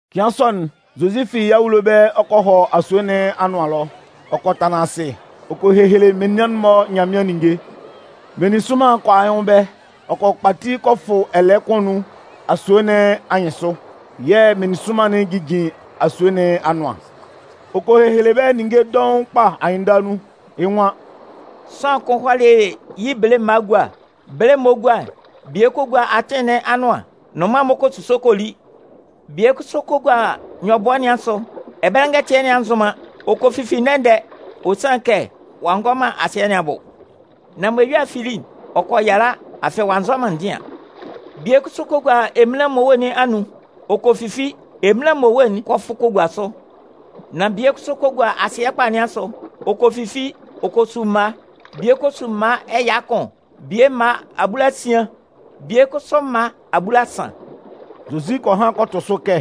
Cɩan sɔ'n, Zozi fi yɩ́ awulo ɛbɛlɛ ɔ kɔ hɔ asue nɩn anʋan ɛlɔ. Ɔ kɔ tanlan asɩ, ɔ kɔ hehele menian'n-mɔ Nyanmɩan ninnge. Meninsʋnman kɔ a yɩ́ nwʋn ɛbɛlɛ. Ɔ kɔ kpati kɔ fʋ kɔ tanlan ɛlɛɛ kʋn anun asue nɩn anyɩnsʋ yɛ̂ meninsʋnman'n jijin asue nɩn anʋan. Ɔ kɔ hehele bɛ́ ninnge dɔʋn kpa anyɩnndala nun, yɩ́ nwan: “Sʋanlan kʋn hɔlɩ yɩ́ bele mma egua. Mɛlɛ mɔ ɔ 'gua'n, bie kɔ gua atɩn nɩn anʋan, nnʋnman'n-mɔ kɔ a kɔ suso kɔ li. Bie kʋsʋ kɔ gua nyɔbʋɛ nɩn asʋ. Ɛbɛlɛ ngɛtɩɛ nɩn a nzʋn man. Ɔ kɔ fifi ndɛ-ndɛ. Ɔ sanlɩn kɛ ɔ'a ngɔ man asɩɛ bʋ. Nan mɔ eyua'n fili'n, ɔ kɔ yala, afɩ ɔ'a nzɔ man ndɩan. Bie kʋsʋ kɔ gua eminlan mmowe nɩn anun. Ɔ kɔ fifi. Eminlan mmowe'n kɔ fʋ kɔ gua sʋ. Nan bie kʋsʋ kɔ gua asɩɛ kpa nɩn asʋ, ɔ kɔ fifi. Ɔ kɔ su mma. Bie kɔ su mma ɛya kʋn, bie mma abulasian, bie kʋsʋ mma abulasan.” Zozi kɔ han kɔ tʋ sʋ kɛ: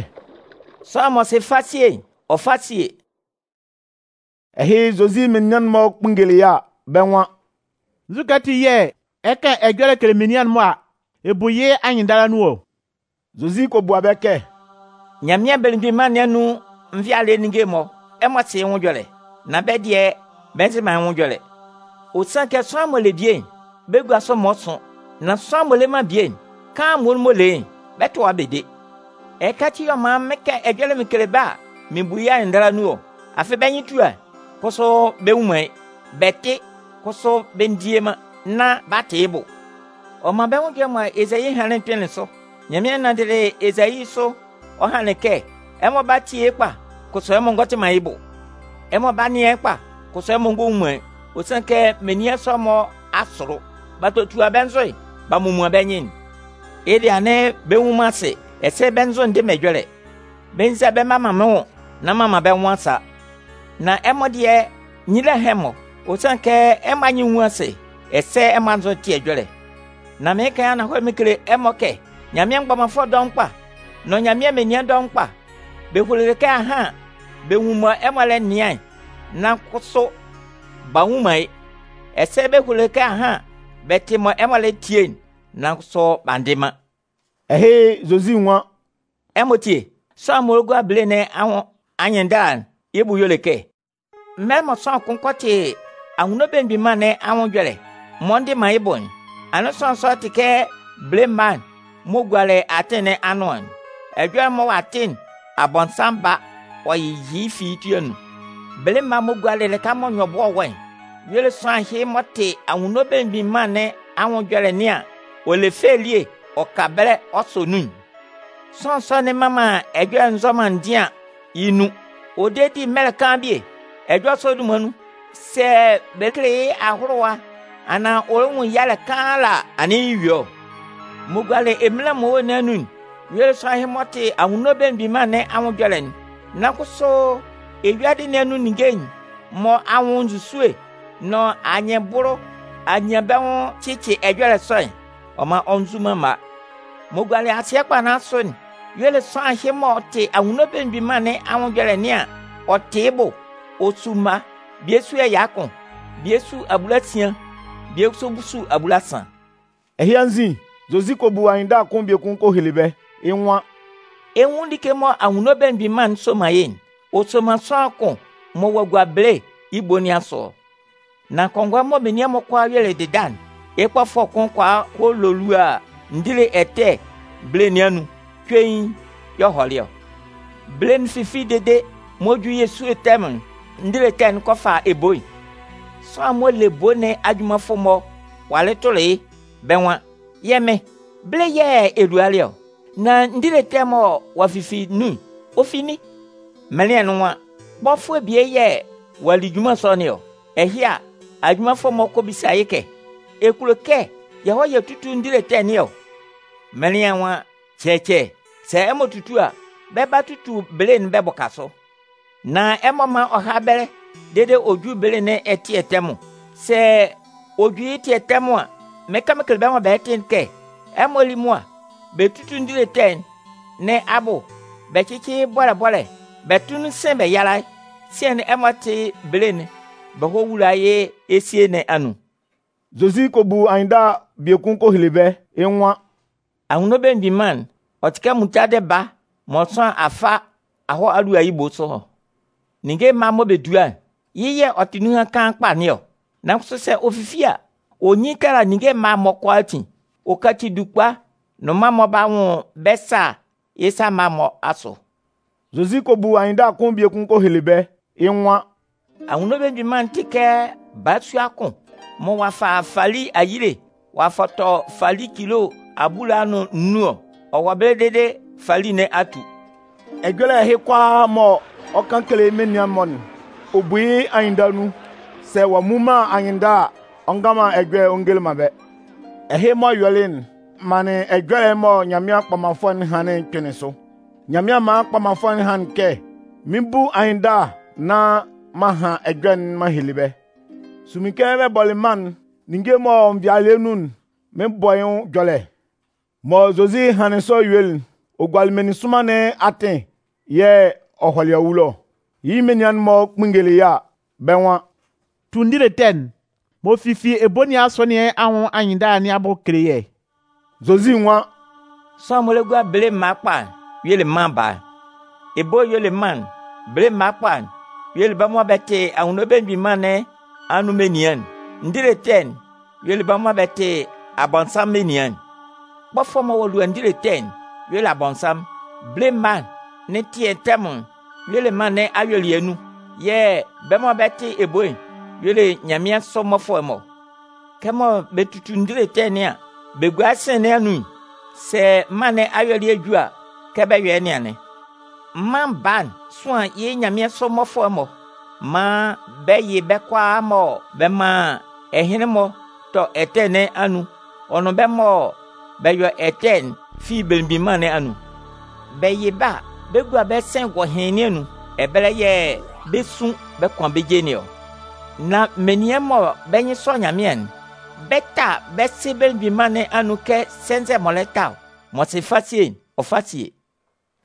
“Sʋanlan m'ɔ sɩ fasie'n, ɔ fá síe!” Ɛhɩ, Zozi menian'n-mɔ kpunngelɩ yɩ́ a, bɛ́ nwan: “Nzukɛ ati yɛ̂ ɛ 'kan ɛjɔlɛ kele menian'n-mɔ a, ɛ bu yɩ́ anyɩnndala nun ɔ?” Zozi kɔ bua bɛ́ kɛ: “Nyanmɩan Belemgbin Mân nɩn anun nvɩalɩɛ ninnge'n-mɔ, ɛmɔ sɩ yɩ́ nwʋn ɛjɔlɛ. Nan bɛ́ dɩɛ, bɛ nzɩ man yɩ́ nwʋn ɛjɔlɛ. Ɔ sanlɩn kɛ sʋanlan m'ɔ le bie'n, bɛ 'gua sʋ maan ɔ sʋn. Nan sʋanlan m'ɔ le man bie'n, kaan'n muonun m'ɔ le yɩ́'n, bɛ 'tʋa yɩ́ bɛ de. Ɛhɩka ati yɛ̂ mɩn 'kan ɛjɔlɛ mɩn kele bɛ́ a, mɩn bu yɩ́ anyɩnndala nun ɔ. Afɩ bɛ́ nyɩn tua yɩ́, kʋsʋ bɛ nnwun man yɩ́. Bɛ tɩ, kʋsʋ bɛ ndie man nán b'a tɩ yɩ́ bʋ. Ɔ man bɛ́ nwʋn ɛjɔlɛ'n mɔ Ezayi hanlɩn'n kpɩnlɩn sʋ. Nyanmɩan nanndɩlɩ Ezayi sʋ ɔ hanlɩn kɛ: Ɛmɔ 'ba tie yɩ́ kpa, kʋsʋ ɛmɔ ngɔ tɩ man yɩ́ bʋ. Ɛmɔ 'ba nɩan yɩ́ kpa, kʋsʋ ɛmɔ ngɔ nwun man yɩ́. Ɔ sanlɩn kɛ menian sɔ'n-mɔ a sʋlʋ. B'a totua bɛ́ nzʋ'n b'a momuan bɛ́ nyɩn'n. Yɩ́ dɩɛ, anɩn bɛ nnwun man asɩ, ɛsɛ bɛ́ nzʋ'n ndɩ man ɛjɔlɛ. Bɛ nza bɛ mma man mɩ́n nwʋn nán m'an man bɛ́ nwʋn a sa. “Nan ɛmɔ dɩɛ, nyila hán ɛmɔ. Ɔ sanlɩn kɛ ɛmɔ anyɩn'n nwun asɩ, ɛsɛ ɛmɔ anzʋ'n tɩ ɛjɔlɛ. Nan mɩɩn kan yɩ́ ananhɔlɛ mɩn kele ɛmɔ kɛ: Nyanmɩan mgbɔmanfʋɛ dɔʋn kpa, nʋn Nyanmɩan menian dɔʋn kpa, bɛ hulolɩ kɛ ahan bɛ nwun mɔ ɛmɔ lɛ nɩan'n, nan kʋsʋ b'a nnwun man yɩ́. Ɛsɛ bɛ hulolɩ kɛ ahan bɛ tɩ mɔ ɛmɔ lɛ tie'n, nan kʋsʋ b'a ndɩ man.” Ɛhɩ, Zozi nwan: “Ɛmɔ tíe, sʋanlan'n m'ɔ gua bele nɩn anwʋn anyɩnndala nɩn abʋ'n y'ɔ le kɛ: Mɛlɛ mɔ sʋanlan kʋn kɔ tɩ Anwunno Belemgbin Mân nɩn anwʋn ɛjɔlɛ m'ɔ ndɩ man yɩ́ bʋ'n, anɩn sʋanlan sɔ'n tɩ kɛ bele mma'n m'ɔ gualɩ atɩn nɩn anʋan'n. Ɛjɔlɛ'n mɔ ɔ'a tɩ'n, Abɔnsanmʋn ba ɔ yɩ fi yɩ́ ti anun. Bele mma'n m'ɔ gualɩ lɩka mɔ nyɔbʋɛ'n wɔ'n y'ɔ le sʋanlan ɛhɩ m'ɔ tɩ Anwunno Belemgbin Mân nɩn anwʋn ɛjɔlɛ nɩn an, ɔ le fɛ elie ɔ ka ɛbɛlɛ ɔ sɔ nun'n. Sʋanlan sɔ'n mman man ɛjɔlɛ'n nzɔ man ndɩan yɩ́ nun. Ɔ de di mɛlɛ kaan bie. Ɛjɔlɛ sɔ'n dunman nun, sɛ bɛ kele yɩ́ ahʋlʋwa anaan ɔ nwun yalɛ kaan ala a, anɩn yɩ́ eyue ɔ. M'ɔ gualɩ eminlan mmowe nɩn anun'n y'ɔ le sʋanlan ɛhɩ m'ɔ tɩ Anwunno Belemgbin Mân nɩn anwʋn ɛjɔlɛ'n, nan kʋsʋ eyuadɩ nɩn anun ninnge'n-mɔ anwʋn nzusue'n nʋn anyɩnbʋlʋ anyanbɛnwʋn'n cɩcɩ ɛjɔlɛ sɔ'n. Ɔ man ɔ nzu man mma. M'ɔ gualɩ asɩɛ kpa nɩn asʋ'n y'ɔ le sʋanlan ɛhɩ m'ɔ tɩ Anwunno Belemgbin Mân nɩn anwʋn ɛjɔlɛ nɩn an, ɔ tɩ yɩ́ bʋ'n. Ɔ su mma. Bie su ɛya kʋn, bie su abulasian, bie kʋsʋ su abulasan.” Ɛhɩ anzin, Zozi kɔ bu anyɩnndala kʋn biekun kɔ hele bɛ́. Yɩ́ nwan: “Ɛ 'nwun like mɔ Anwunno Belemgbin Mân'n soman yɩ́'n: Ɔ soman sʋanlan kʋn mɔ ɔ'a gua bele yɩ́ ebo nɩn asʋ ɔ. Nan kɔngɔɛ mɔ menian'n-mɔ kʋalaa yuelɩ dɩda'n, yɩ́ kpɔfʋɛ kʋn kɔ a kɔ lolua ndile ɛtɛ bele nɩn anun, cuein yɛ̂ ɔ hɔlɩ ɔ. Bele'n fifili dede mɔ ɔ 'ju yɩ́ esúe tɛmʋn'n, ndile ɛtɛ'n kɔ fa ebo'n. “Sʋanlan'n m'ɔ le ebo nɩn ajunmanfʋ'n-mɔ walɩ tʋlɩ yɩ́, bɛ́ nwan: ‘Yɛ́ Mɩn, bele yɛ̂ ɛ lualɩ ɔ. Nan ndile ɛtɛ'n mɔ ɔ'a fifi nun'n, ɔ fi nin?’ “Mɩnlɩan'n nwan: ‘Kpɔfʋɛ bie yɛ̂ ɔ'a li junman sɔ nɩn ɔ.’ “Ɛhɩ a, ajunmanfʋ'n-mɔ kɔ bisa yɩ́ kɛ: ‘Ɛ kulo kɛ yɛ hɔ́ tútu ndile ɛtɛ nɩn ɔ?’ “Mɩnlɩan'n nwan: ‘Cɛcɛ, sɛ ɛmɔ tutu a, bɛ 'ba tutu bele'n bɛ bʋka sʋ. Nan ɛmɔ mán ɔ há nun dede ɔ jú bele nɩn ɛtɩɛ tɛmʋn. Sɛ ɔ ju yɩ́ ɛtɩɛ tɛmʋn an, mɩn 'kan mɩn kele bɛ́ mɔ bɛ 'tɩ'n kɛ: Ɛmɔ lí mʋa bɛ tútu ndile ɛtɛ nɩn abʋ bɛ cɩ́cɩ yɩ́ bɔ́lɛ bɔ́lɛ bɛ tʋ́ nun sɩ̂n bɛ yála yɩ́. Sian'n, ɛmɔ tɩ́ bele'n bɛ hɔ́ wúla yɩ́ mɩ́n ésie nɩn anun.’” Zozi kɔ bu anyɩnndala biekun kɔ hele bɛ́, yɩ́ nwan: “Anwunno Belemgbin Mân'n, ɔ tɩ kɛ muntadɩ baa mɔ sʋanlan a fa a hɔ a lua yɩ́ ebo sʋ ɔ. Ninnge mma'n mɔ bɛ dua'n, yɩ́ y'ɔ tɩ bɛ́ nunhan kaan kpa nɩn ɔ. Nan kʋsʋ sɛ ɔ fifi a, ɔ nyin tala ninnge mma'n-mɔ kʋalaatin. Ɔ kaci dukpa nnʋnman'n-mɔ ba bɛ nwʋn bɛ́ sâ yɩ́ sa mma'n-mɔ asʋ.” Zozi kɔ bu anyɩnndala kʋn biekun kɔ hele bɛ́. Yɩ́ nwan: “Anwunno Belemgbin Mân'n tɩ kɛ balasua kʋn mɔ ɔ'a fa fali ayile ɔ'a fɔtɔ fali cilo abulaa nʋn nnun ɔ. Ɔ wɔ ɛbɛlɛ dede fali nɩn a tu.” Ɛjɔlɛ ɛhɩ kʋalaa mɔ ɔ 'kan kele menian'n-mɔ'n, ɔ bu yɩ́ anyɩnndala nun. Sɛ ɔ'a mmun man anyɩnndala a, ɔ ngan man ɛjɔlɛ'n ɔ ngele man bɛ́. Ɛhɩ m'ɔ yɔlɩ'n manlɩn ɛjɔlɛ'n mɔ Nyanmɩan kpɔmanfʋɛ'n hanlɩn'n kpɩnlɩn sʋ. Nyanmɩan manlɩn kpɔmanfʋɛ'n hanlɩn kɛ: Mɩn 'bu anyɩnndala nán m'an han ɛjɔlɛ'n m'an hele bɛ́. Sunmin kɛ bɛ bɔlɩ mân'n, ninnge m'ɔ wɔ nvɩalɩɛ nun'n, mɩn 'bɔ yɩ́ nwʋn ɛjɔlɛ. Mɔ Zozi hanlɩn sɔ yuelɩ'n, ɔ gualɩ meninsʋnman nɩn atɩn yɛ̂ ɔ hɔlɩ awulo ɔ. Yɩ́ menian'n-mɔ kpunngelɩ yɩ́ a, bɛ́ nwan: “Tu ndile ɛtɛ'n m'ɔ fifi ebo nɩn asʋ nɩn anwʋn anyɩnndala nɩn abʋ kele yɛ́.” Zozi nwan: “Sʋanlan'n m'ɔ le gua bele mma kpa'n y'ɔ le Mân Baa'n. Ebo'n y'ɔ le mân'n. Bele mma kpa'n y'ɔ le bɛ́ mɔ bɛ́ tɩ Anwunno Belemgbin Mân nɩn anun menian'n. Ndile ɛtɛ'n, y'ɔ le bɛ́ mɔ bɛ tɩ Abɔnsanmʋn menian'n. Kpɔfʋɛ'n mɔ ɔ'a lua ndile ɛtɛ'n y'ɔ le Abɔnsanmʋn. Bele mma nɩn ɛtɩɛ tɛmʋn'n y'ɔ le mân nɩn ayuelɩɛ nun, yɛ̂ bɛ́ mɔ bɛ 'tɩ ebo'n y'ɔ le nyanmɩansʋ mmɔfʋɛ'n-mɔ. “Kɛmɔ bɛ tutu ndile ɛtɛ nɩan an, bɛ gua yɩ́ sɩ̂n nɩn anun'n, sɛ mân nɩn ayuelɩɛ'n ju a, kɛ bɛ 'yɔ yɩ́ nɩn anɩn. Mân Baa'n 'sʋan yɩ́ nyanmɩansʋ mmɔfʋɛ'n-mɔ maan bɛ yɩ bɛ́ kʋalaa mɔ bɛ man ɛhɩnlɩn-mɔ tɔ ɛtɛ nɩn anun ɔ nʋn bɛ́ mɔ bɛ yɔ ɛtɛ'n fi yɩ́ Belemgbin Mân nɩn anun. Bɛ yɩ bɛ́ a, bɛ 'gua bɛ́ sɩ̂n gɔhɩɩn nɩn anun. Ɛbɛlɛ yɛ̂ bɛ 'sun bɛ kʋan bɛ́ je nɩn ɔ. Nan menian mɔ bɛ́ nyɩn sɔ Nyanmɩan'n, bɛ 'ta bɛ́ Sɩ Belemgbin Mân nɩn anun kɛ sɛnzɛ m'ɔ lɛ ta ɔ. M'ɔ sɩ fasie'n, ɔ fá sie!”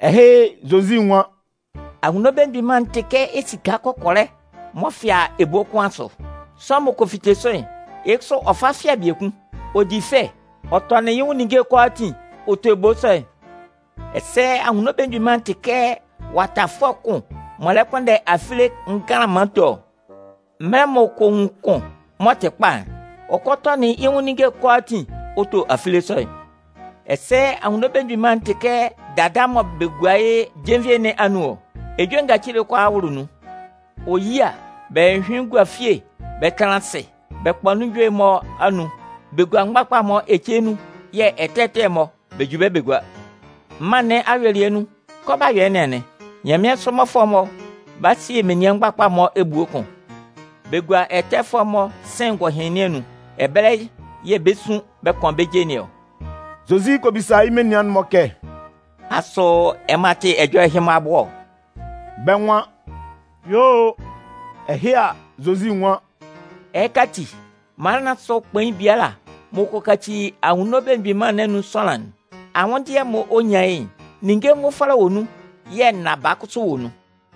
Ɛhɩ, Zozi nwan: “Anwunno Belemgbin Mân'n tɩ kɛ esika kɔkɔlɛ m'ɔ fɩa ebo kʋn asʋ. Sʋanlan m'ɔ kɔ fite sʋ'n, yɩ́ kʋsʋ ɔ fa fɩa biekun. Ɔ di fɛ, ɔ tɔnɩn yɩ́ nwʋn ninnge'n kʋalaatin ɔ to ebo sɔ'n. “Ɛsɛ Anwunno Belemgbin Mân'n tɩ kɛ watafʋɛ kʋn m'ɔ lɛ kpʋnndɛ afile nganlanman to ɔ. Mɛlɛ m'ɔ kɔ nwun kʋn m'ɔ tɩ kpa'n, ɔ kɔ tɔnɩn yɩ́ nwʋn ninnge'n kʋalaatin ɔ to afile sɔ'n. “Ɛsɛ Anwunno Belemgbin Mân'n tɩ kɛ dada mɔ bɛ gua yɩ́ jenvie nɩn anun ɔ. Ejue ngacile kʋalaa wʋlʋ nun. Ɔ yi a, bɛ hyʋhyʋɩn gua fie bɛ tanlan asɩ bɛ kpa ejue'n-mɔ anun. Bɛ gua mgbakpa'n-mɔ ece nun yɛ̂ ɛtɛ ɛtɛ'n-mɔ, bɛ ju bɛ gua. Mân nɩn ayuelɩɛ nun kɛ ɔ 'ba yɔ yɩ́ nɩn anɩn. Nyanmɩansʋ mmɔfʋɛ'n-mɔ 'ba sie menin mgbakpa'n-mɔ ebue kʋn bɛ gua ɛtɛfʋɛ'n-mɔ sɩ̂n gɔhɩɩn nɩn anun. Ɛbɛlɛ yɛ̂ bɛ 'sun bɛ kʋan bɛ́ je nɩn ɔ.” Zozi kɔ bisa yɩ́ menian'n-mɔ kɛ: “Asʋ ɛmɔ a tɩ ɛjɔlɛ ɛhɩ-mɔ abʋ ɔ?” Bɛ́ nwan: “Yuo o!” Ɛhɩ a, Zozi nwan: “Ɛhɩka ati, mala nɩn asʋ kpain biala m'ɔ kɔ kaci Anwunno Belemgbin Mân nɩn anun sʋanlan'n, anwʋndɩɛ'n m'ɔ nyan yɩ́'n, ninnge nvʋfɔlɛ wɔ nun yɛ̂ nnaba kʋsʋ wɔ nun.”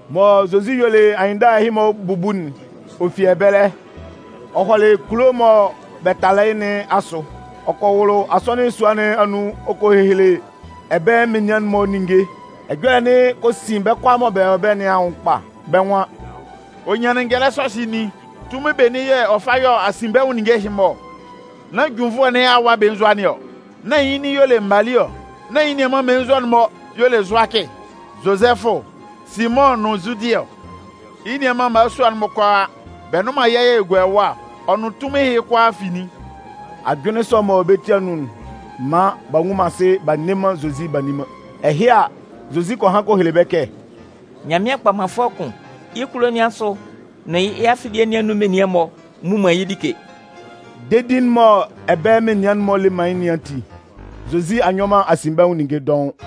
Mɔ Zozi yuelɩ anyɩnndala ɛhɩ-mɔ bubu'n, ɔ fi ɛbɛlɛ ɔ kɔ hɔ kulo'n mɔ bɛ talɩ yɩ́ nɩn asʋ. Ɔ kɔ wʋlʋ asɔnɩn sua nɩn anun ɔ kɔ hehele ɛbɛlɛ menian'n-mɔ ninnge, ɛjɔlɛ'n kɔ sin bɛ́ kʋalaa mɔ bɛ wɔ ɛbɛlɛ nɩn anwʋn kpa. Bɛ́ nwan: “Ɔ nyanlin ngɛlɛ ɛhɩ nin? Tunmin benin yɛ̂ ɔ fa yɔ asinbɛnwʋn ninnge ɛhɩ-mɔ ɔ? Nán junnvʋɛ nɩn awa belenzua nɩn ɔ? Nán yɩ́ nin y'ɔ le Mali ɔ? Nán yɩ́ nianman mmelenzua'n-mɔ y'ɔ le Zʋakɩ, Zozɛfʋ, Simʋn nʋn Zudɩ ɔ? Yɩ́ nianman mmalasua'n-mɔ kʋalaa, bɛ nnʋn man yɛ́ yɛ̂ ɔ gua ɛwa ɔ? Ɔ nʋn tunmin ɛhɩ kʋalaa fi nin?” Ajʋnlɩn sɔ'n m'ɔ wɔ bɛ́ ti anun'n maan b'a nnwun man asɩ b'a nne man Zozi b'a nni man. Ɛhɩ a, Zozi kɔ han kɔ hele bɛ́ kɛ: “Nyanmɩan kpɔmanfʋɛ kʋn, yɩ́ kulo nɩn asʋ nʋn yɩ́ afilie nɩn anun menian'n-mɔ mmu man yɩ́ like.” Dedi'n mɔ ɛbɛlɛ menian'n-mɔ le man yɩ́ nɩn ati, Zozi a nyɔ man asinbɛnwʋn ninnge dɔʋn.